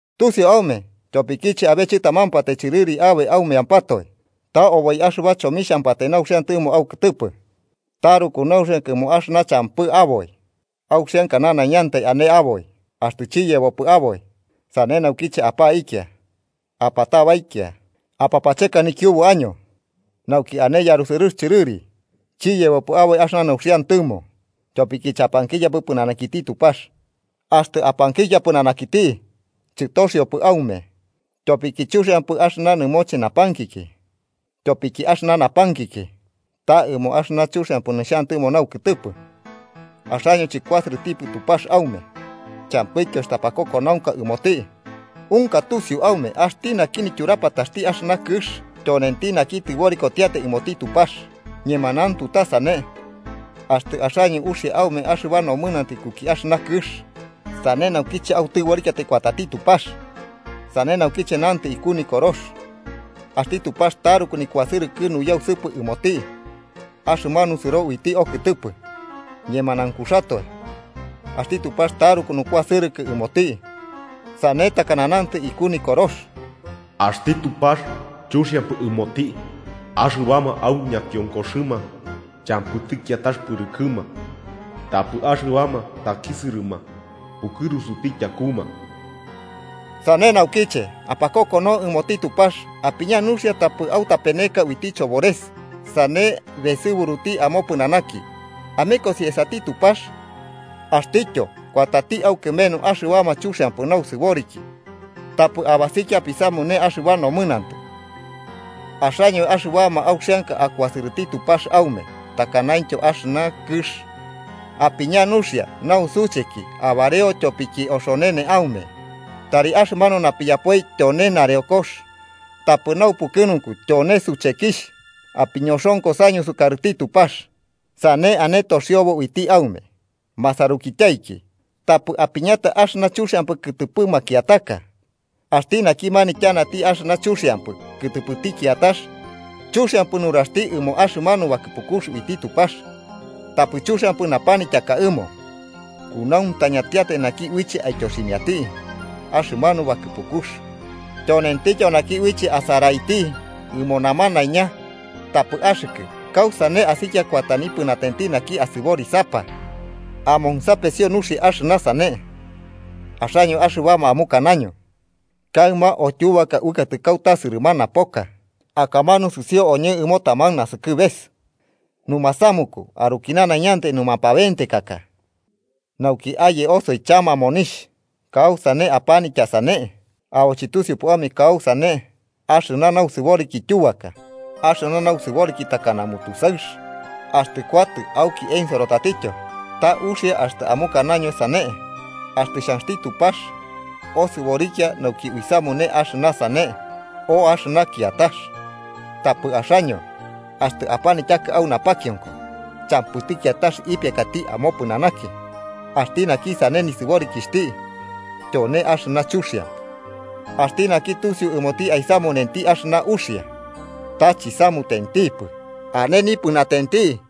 ¿Tusiu aume tyopikiche abe chɨtamampatai chɨrɨri aboi aumeampatoe? Ta oboi axɨba chomixhampatai nauxiantɨmo aukɨtɨpɨ. Taruku nauxianka ɨmo axɨna champɨ aboi auxianka nanaiñantai ane aboi, axtɨ chiyebopɨ aboi, sane naukiche apaikia, apatabaikia apapacheka nikiubu año nauki ane yarusɨrɨx chɨrɨri. Chiyebopɨ aboi axɨna nauxiantɨmo tyopiki chapankikiapɨ pɨnanakiti Tupax. Axtɨ apankikia pɨnanakiti, chɨtoxiopɨ aume tyopiki chuxiampɨ axɨna nɨmoche napankiki, tyopiki axɨna napankiki ta ɨmo axɨna chuxiampɨ nixhantɨmo naukɨtɨpɨ. Axaño chɨkuasɨrɨtipɨ Tupax aume champɨityo axtɨ apakokonaunka ɨmoti. Unka tusiu aume axti naki nityurapataxti axɨna kɨx tyonenti naki tɨborikotiatai ɨmoti Tupax. ¡Ñemanauntu ta sane! Axtɨ axaño uxia aume axɨba nomɨnantɨ ikuki axɨna kɨx, sane naukiche autɨborikiatai kuatati Tupax. Sane naukiche nantɨ iku Nikorox: “Axti Tupax taruku nikuasɨrɨkɨ nuyausɨpɨ ɨmoti axɨmanu sɨro uiti okɨtɨpɨ.” Ñemanaunkuxatoe, axti Tupax taruku nukuasɨrɨkɨ ɨmoti. Sane takana nantɨ iku Nikorox: “Axti Tupax chuxiampɨ ɨmoti axɨbama au ñakionkoxɨma champɨti kiatax pɨrɨkɨma, tapɨ axɨbama takisɨrɨma pukɨrusuti tyakuma.” Sane naukiche apakokonau ɨmoti Tupax. Apiña nuxia tapɨ autapeneka uiti chobores sane besɨburuti amopɨnanaki. Amekosi esati Tupax, axtityo kuatati aukɨmenu. ¡Axɨbama chuxiampɨ nausɨboriki, tapɨ abasikia apisamune axɨba nomɨnantɨ, axaño axɨbama auxianka akuasɨrɨti Tupax aume takanaintyo axɨna kɨx! ¡Apiña nuxia nausucheki abareo tyopiki oxonene aume! ¡Tari axɨmanu napiyapoi tyone nareokox, tapɨ naupukɨnunku tyone suchekixh! Apiñoxonkosaño sukarɨti Tupax, sane ane toxiobo uiti aume. Masarukityaiki, tapɨ apanityaka axɨna chuxiampɨ kɨtɨpɨ makiataka. Axti naki manityanati axɨna chuxiampɨ kɨtɨpɨti kiatax, chuxiampɨ nuraxti ɨmo axɨmanu bakɨpukux uiti Tupax, tapɨ chuxiampɨ napanityaka ɨmo. Kunauntañantiatai naki uiche aityoximiati axɨmanu bakɨpukux, tyonentityo naki uiche asaraiti ɨmo namanaiña, tapɨ axɨkɨ, ¿kausane asikia kuata nipɨnatenti naki asɨborisapa? Amonsapesio nuxia axɨna sane, axaño axɨbama amukanaño: “Kaɨma o tyubaka uɨkatɨ kauta sɨrɨmana poka, akamanu sɨsio oñɨ ɨmo taman nasɨkɨbeka, numasamuku aruki nanaiñantai numapabentekaka nauki aye osoi chama monixh.” ¿Kausane apanitya sane, abo chɨtusiupɨ aume kausane axɨna nausɨboriki tyubaka? Axɨna nausɨboriki takana mutusaɨx axtɨ kuatɨ auki ensoro tatityo. Ta uxia axtɨ amukanaño sane: “Axtɨ xhanxti Tupax, osɨborikia nauki uisamune axɨna sane o axɨna kiatax.” Tapɨ axaño, axtɨ apanityaka au napakionko champɨti kiatax ipiakati amopɨnanaki. Axti naki sane nisɨborikixhti tyone axɨna chuxiampɨ. Axti naki tusiu ɨmoti aisamunenti axɨna uxia ta chisamutentipɨ, ane nipɨnatenti.